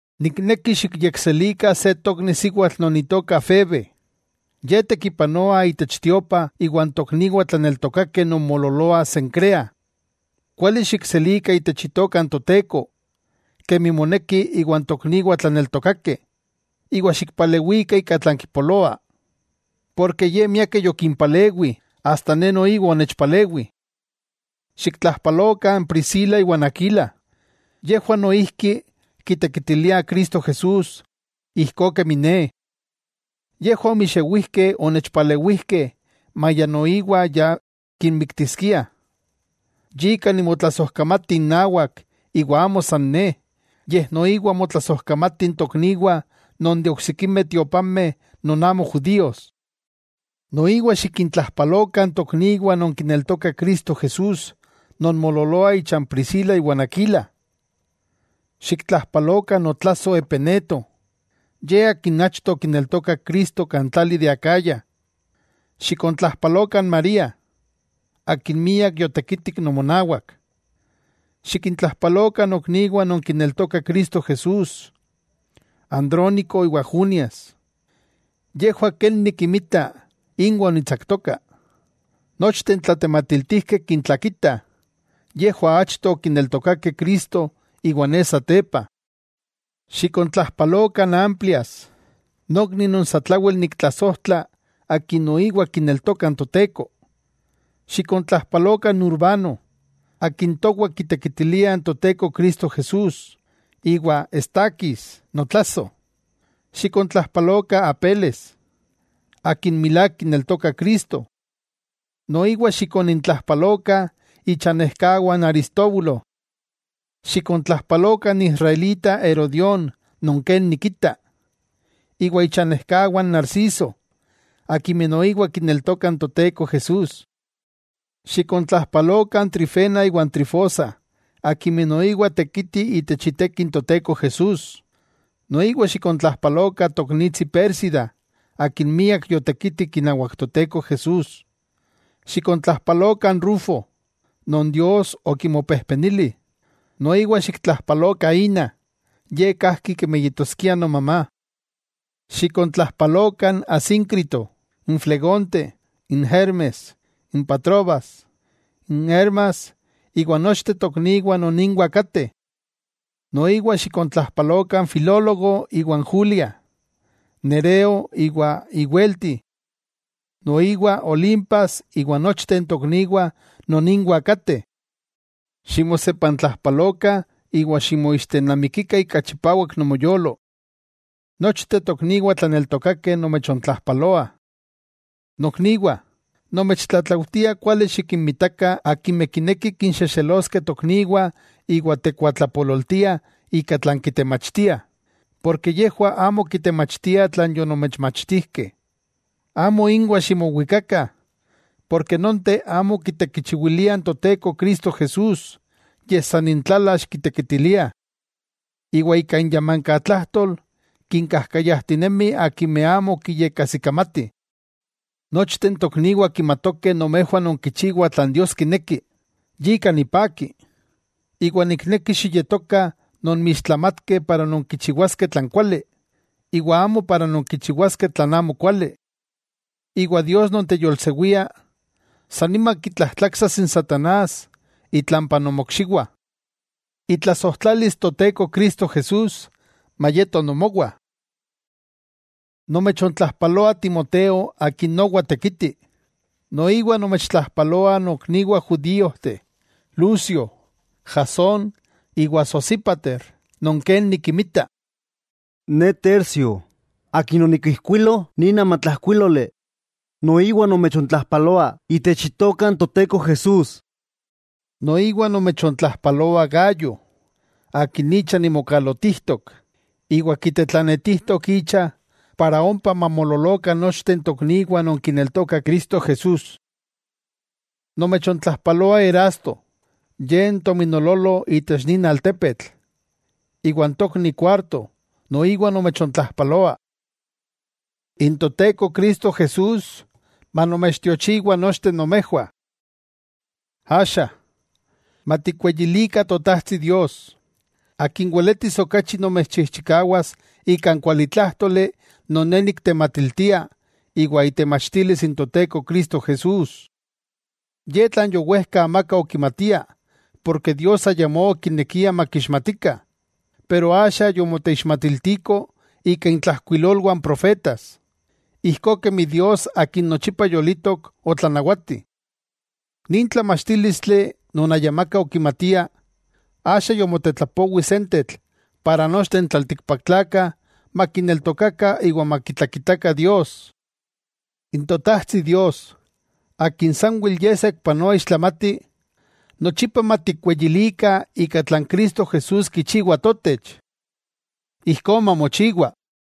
Nikneki xikyekselikah se tokni siwatl non itoka Febe. Ye tekipanoa itech tiopa iwan tokniwah tlaneltokakeh non moololoah Cencreas. Kuali xikselikah itech Itoka n Toteko, kemi moneki iwan tokniwah tlaneltokakeh, iwa xikpalewikah ika tlan kipoloa. Porke ye miakeh yokimpalewi, asta ne noiwa onechpalewi. Xiktlajpalokah n Priscila iwa n Aquila, yejwah noijki kitekitiliah Cristo Jesús ijkó kemi ne. Yejwah omixewijkeh onechpalewijkeh maya noiwa ya kinmiktiskiah. Yika nimotlasojkamati innawak iwa amo san ne, yej noiwa motlasojkamatih n tokniwah non de oksikimeh tiopameh non amo judíos. Noiwa xikintlajpalokah n tokniwah non kineltokah Cristo Jesús non moololoah icha n Priscila iwa n Aquila. Xiktlajpalokah notlasoj Epeneto; ye akin achto okineltokak Cristo kan tlali de Acaya. Xikontlajpalokah n María, akin miak yotekitik nomonawak. Xikintlajpalokah nokniwah non kineltokah Cristo Jesús, Andrónico iwa Junias, yejwah ken nikinmita, inwah onitsaktoka. Nochteh n tlatematiltijkeh kintlakitah, yejwah achto okineltokakeh Cristo, iwa ne satepa. Xikontlajpalokah n Amplias, nokni non satlawel niktlasojtla akin noiwa kineltoka n Toteko. Xikontlajpalokah n Urbano, akin towah kitekitilia n Toteko Cristo Jesús, iwa Estaquis, notlasoj. Xikontlajpalokah Apeles, akin milák kineltoka Cristo. Noiwa xikonintlajpalokah ichanejkawah n Aristóbulo. Xikontlajpalokah n israelita Herodión non ken nikita, iwa ichanejkawah n Narciso akimeh noiwa kineltokah n Toteko Jesús. Xikontlajpalokah n Trifena iwa n Trifosa akimeh noiwa tekitih itech iteki n Toteko Jesús; noiwa xikontlajpalokah toknitsi Pérsida, akin miak yotekitik inawak Toteko Jesús. Xikontlajpalokah n Rufo, non Dios okimopejpenili, noiwa xiktlajpalokah ína, ye kajki kemi yetoskia nomamá. Xikontlapa-lokah Asíncrito, Flegonte, Hermes, Patrobas, Hermas iwa nochteh tokniwah non inwah kateh. Noiwa xikontlajpalokah n Filólogo iwa n Julia, Nereo iwa iwelti. Noiwa Olimpas iwa nochteh n tokniwah non inwah kateh. Ximosepantlajpalokah iwa ximoixtenamikikah ika chipawak nomoyolo. Nochteh tokniwah tlaneltokakeh nomechontlajpaloah. Nokniwah, nomechtlatlaujtia kuali xikinmitakah akimeh kinekih kinxexeloskeh tokniwah iwa tekuatlapololtiah ika tlan kitemachtiah, porke yejwah amo kitemachtiah tlan yonomechmachtijkeh. Amo inwah ximowikakah, porke nonteh amo kitekichiwiliah n Toteko Cristo Jesús, yej san intlalax kitekitiliah. Iwa ika inyamankatlajtol kinkajkayajtinemih akimeh amo kiyekajsikamatih. Nochteh n tokniwah kimatokeh nomejwah nonkichiwah tlan Dios kineki; yika nipaki, iwa nikneki xiyetokah nomixtlamatkeh para nonkichiwaskeh tlan kuali, iwa amo para nonkichiwaskeh tlan amokuali. Iwa Dios non teyolsewia, san nima kitlajtlaksas n satanás itlampa nomokxiwah. Itlasojtlalis Toteko Cristo Jesús mayeto nomowah. Nomechontlajpaloa Timoteo akin nowa tekiti. Noiwa nomechontlajpaloah nokniwah judíojteh Lucio, Jasón iwa Sosípater non ken nikinmita. Ne, Tercio, akin onikijkuilo nin amatlajkuíloli, noiwa nomechontlajpaloa itech itoka n Toteko Jesús. Noiwa nomechontlajpaloa Gayo, akin icha nimokalotijtok, iwa kitetlanetijtok icha para ompa mamoololokah nochteh n tokniwah non kineltokah Cristo Jesús. Nomechontlajpaloa Erasto, ye n tominololo itech nin altepetl, iwa n tokni Cuarto noiwa nomechontlajpaloa. N Toteko Cristo Jesús manomechtiochiwa nochteh nomejwah. Axa, matikweyilikah Totajtsi Dios, Akin weletis okachi nomechchikawas ika n kualitlájtoli non ne niktematiltia iwa itemachtilis n Toteko Cristo Jesús. Ye tlan yowejka amaka okimatia porke Dios ayamó okinekia makixmatikah, pero axa yomoteixmatiltiko ika intlajkuilolwah n profetas, ijkó kemi Dios Akin nochipa yolitok otlanawati. Nin tlamachtílistli non ayamakah okimatia, axa yomotetlapowi sentetl para nochteh n tlaltikpaktlakah makineltokakah iwa makitlakitakah Dios. ¡N Totajtsi Dios, Akin sanwel Ye saikpanoa ixtlamati, nochipa matikweyilikah ika tlan Cristo Jesús kichiwa totech! Ijkó mamochiwa.